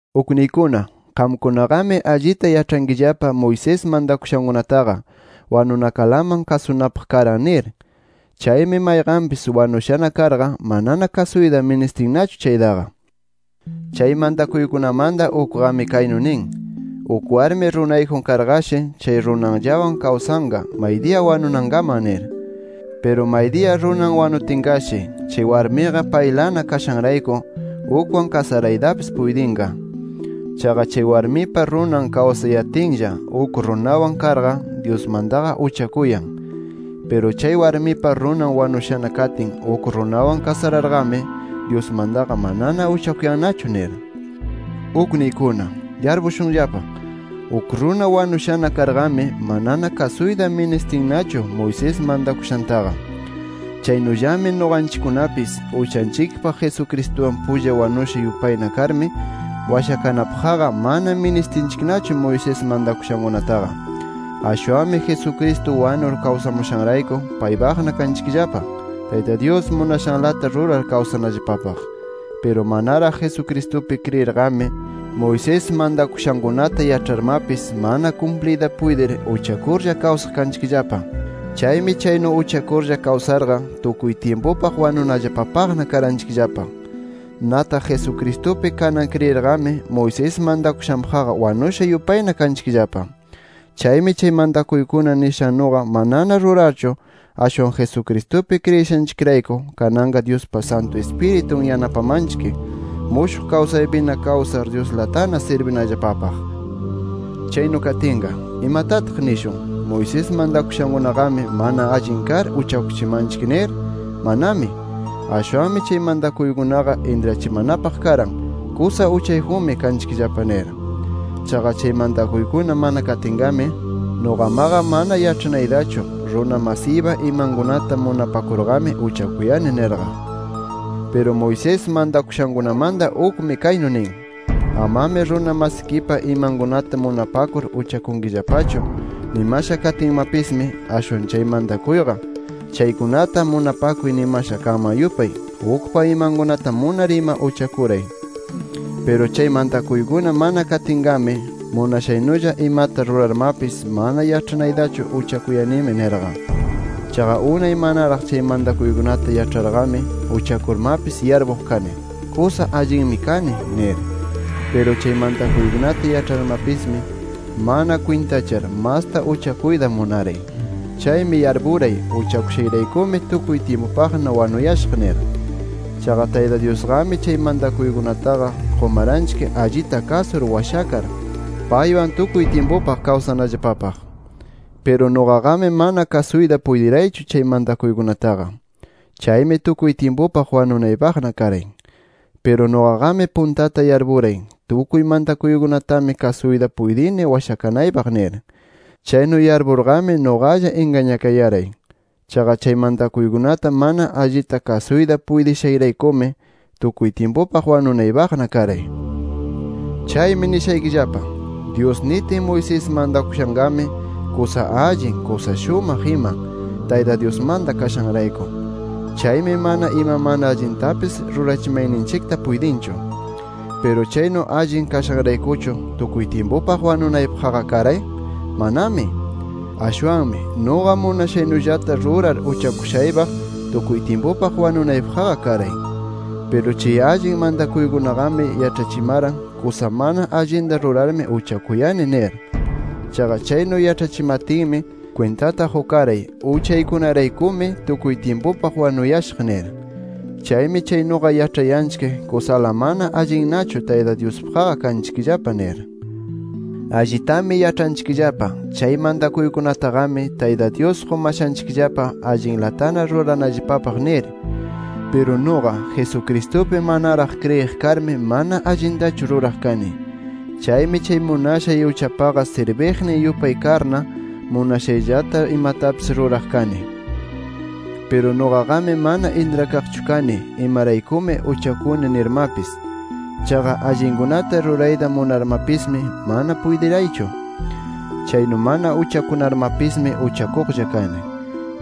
Ukniykuna, qamkunaqami allita yaĉhankillapa Moisés mantakushankunataqa wanunakalaman kasunapaq karan nir. Chaymi mayqanpis wanushana karqa manana kasuyta ministinnachu chaytaqa. Chay mantakuykunamanta ukqami kaynu nin: Uk warmi runayjun karqashi, chay runanllawan kawsanqa maydiya wanunankaman nir. Piru maydiya runan wanutinqashi, chay warmiqa paylana kashanrayku ukwan kasaraytapis puytinqa. Chaqa chay warmipa runan kawsayatinlla, uk runawan karqa Dyusmantaqa uchakuyan. Piru chay warmipa runan wanushana katin, uk runawan kasararqami, Dyusmantaqa manana uchakuyannachu nir. Ukniykuna, yarpushunllapa: Uk runa wanushana karqami, manana kasuyta ministinnachu Moisés mantakushantaqa. Chaynullami nuqanchikkunapis, uchanchikpaq Jesucristuwan pulla wanusha yupayna karmi, washakanapaqqa mana ministinchiknachu Moisés mantakushankunataqa. Ashwanmi Jesucristo wanur kawsamushanrayku paypana kanchikllapa, Tayta Dyus munashanlata rurar kawsanallapapaq. Piru manaraq Jesucristupi kriyirqami, Moisés mantakushankunata yaĉharmapis, mana kumpliyta puytir uchakurlla kawsaq kanchikllapa. Chaymi chaynu uchakurlla kawsarqa tukuy tyimpupaq wanunallapapaqna karanchikllapa. Nataq Jesucristupi kanan kriyirqami, Moisés mantakushanpaqqa wanusha yupayna kanchikllapa. Chaymi chay mantakuykuna nishannuqa manana rurarchu, ashwan Jesucristupi kriyishanchikrayku, kananqa Dyuspa Santu Ispiritun yanapamanchik, mushuq kawsaypina kawsar Dyuslatana sirbinallapapaq. Chaynu katinqa, ¿imatataq nishun? ¿Moisés mantakushankunaqami mana allin kar uchakuchimanchik nir? ¡Manami! Ashwanmi chay mantakuykunaqa intrachimanapaq karan kusa uchayjunmi kanchikllapa nir. Chaqa chay mantakuykuna mana katinqami, nuqamaqa mana yaĉhanaytachu runa masiypa imankunata munapakurqami uchakuyani nirqa. Piru Moisés mantakushankunamanta ukmi, kaynu nin: Amami runa masikipa imankunata munapakur uchakunkillapachu nimasha katinmapismi, ashwan chay mantakuyqa, chaykunata munapakuy nimasha kanman yupay, ukpa imankunata munar ima uchakuray. Piru chay mantakuykuna mana katinqami, munashaynulla imata rurarmapis mana yaĉhanaytachu uchakuyanimi nirqa. Chaqa unay manaraq chay mantakuykunata yaĉharqami, uchakurmapis yarpuq kani, ¡kusa allinmi kani! nir. Piru chay mantakuykunata yaĉharmapismi, mana kwintachar masta uchakuyta munaray. Chaymi yarpuray uchakushayraykumi tukuy tyimpupaqna wanuyashaq nir. Chaqa Tayta Dyusqami chay mantakuykunataqa qumaranchik allita kasur washakar, paywan tukuy tyimpupaq kawsanallapapaq. Piru nuqaqami mana kasuyta puytiraychu chay mantakuykunataqa. Chaymi tukuy tyimpupaq wanunaypaqna karay. Piru nuqaqami puntata yarpuray, tukuy mantakuykunatami kasuyta puytini washakanaypaq nir. Chaynu yarpurqami nuqalla ingañakayaray. Chaqa chay mantakuykunata mana allita kasuyta puytishayraykumi tukuy tyimpupaq wanunaypaqna karay. Chaymi nishaykillapa: Dyus nitin Moisés mantakushanqami kusa allin, kusa shumaq ima, Tayta Dyusmanta kashanrayku. Chaymi mana ima mana allintapis rurachimayninchikta puytinchu. ¿Piru chaynu allin kashanraykuchu tukuy tyimpupaq wanunaypaqqa karay? ¡Manami! Ashwanmi nuqa munashaynullata rurar uchakushaypaq tukuy tyimpupaq wanunaypaqqa karay. Piru chay allin mantakuykunaqami yaĉhachimaran, kusa mana allinta rurarmi uchakuyani nir. Chaqa chaynu yaĉhachimatinmi kwintata qukaray, uchaykunaraykumi tukuy tyimpupaq wanuyashaq nir. Chaymi chaynuqa yaĉhayanchik, kusala mana allinnachu Tayta Dyuspaqqa kanchikllapa nir. Allitami yaĉhanchikllapa, chay mantakuykunataqami, Tayta Dyus qumashanchikllapa allinlatana ruranallapapaq nir. Piru nuqa, Jesucristupi manaraq kriyiq karmi, mana allintachu ruraq kani. Chaymi chay munashay uchapaqa sirbiqnin yupay karna, munashayllata imatapis ruraq kani. Piru nuqaqami mana intrakaqchu kani, imaraykumi uchakuni nirmapis. Chaqa allinkunata rurayta munarmapismi, mana puytiraychu. Chaynu mana uchakunarmapismi uchakuqlla kani.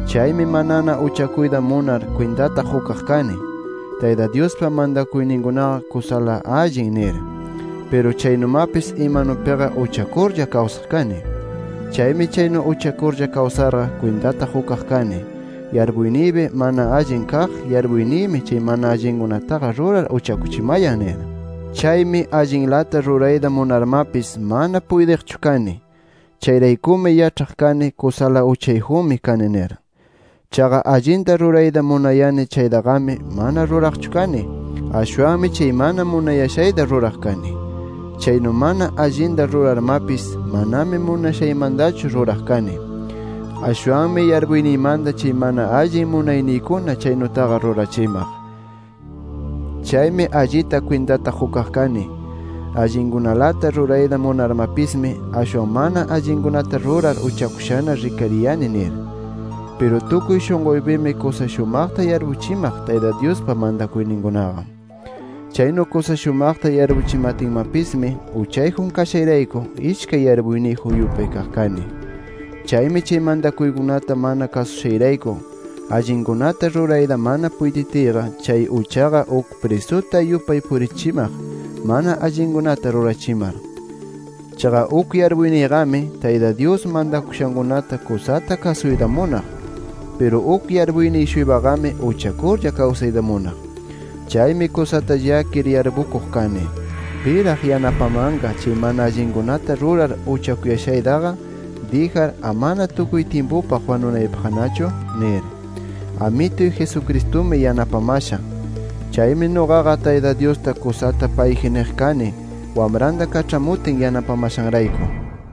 Chaymi manana uchakuyta munar kwintata qukaq kani, Tayta Dyuspa mantakuyninkunaqa kusala allin nir. Piru chaynumapis imanupiqa uchakurlla kawsaq kani. Chaymi chaynu uchakurlla kawsarqa kwintata qukaq kani, yarpuyniypi mana allin kaq yarpuyniymi chay mana allinkunataqa rurar uchakuchimayan nir. Chaymi allinlata rurayta munarmapis mana puytiqchu kani. Chayraykumi yaĉhaq kani kusala uchayjunmi kani nir. Chaqa allinta rurayta munayani chaytaqami, mana ruraqchu kani. Ashwanmi chay mana munayashayta ruraq kani. Chaynu mana allinta rurarmapis, manami munashaymantachu ruraq kani. Ashwanmi yarpuyniymanta chay mana allin munayniykuna, chaynutaqa rurachimaq. Chaymi allita kwintata qukaq kani, allinkunalata rurayta munarmapismi, ashwan mana allinkunata rurar uchakushana rikariyani nir. Piru tukuy shunquypimi, kusa shumaqta yarpuchimaq Tayta Dyuspa mantakuyninkunaqa. Chaynu kusa shumaqta yarpuchimatinmapismi, uchayjun kashayrayku, ishkay yarpuyniyjun yupay kaq kani. Chaymi chay mantakuykunata mana kasushayrayku, allinkunata rurayta mana puytitiyqa, chay uchaqa uk prisuta yupay purichimaq mana allinkunata rurachimar. Chaqa uk yarpuyniyqami, Tayta Dyus mantakushankunata kusata kasuyta munaq. Piru uk yarpuyniy-shuypaqami uchakurlla kawsayta munaq. Chaymi kusata llakir yarpukuq kani: ¿Piraq yanapamanqa, chay mana allinkunata rurar uchakuyashaytaqa dijar, amana tukuy tyimpupaq wanunaypaqnachu? nir. ¡Amituy Jesucristumi yanapamasha! Chaymi nuqaqa Tayta Dyusta kusata payji niq kani Wamranta kaĉhamutin yanapamashanrayku.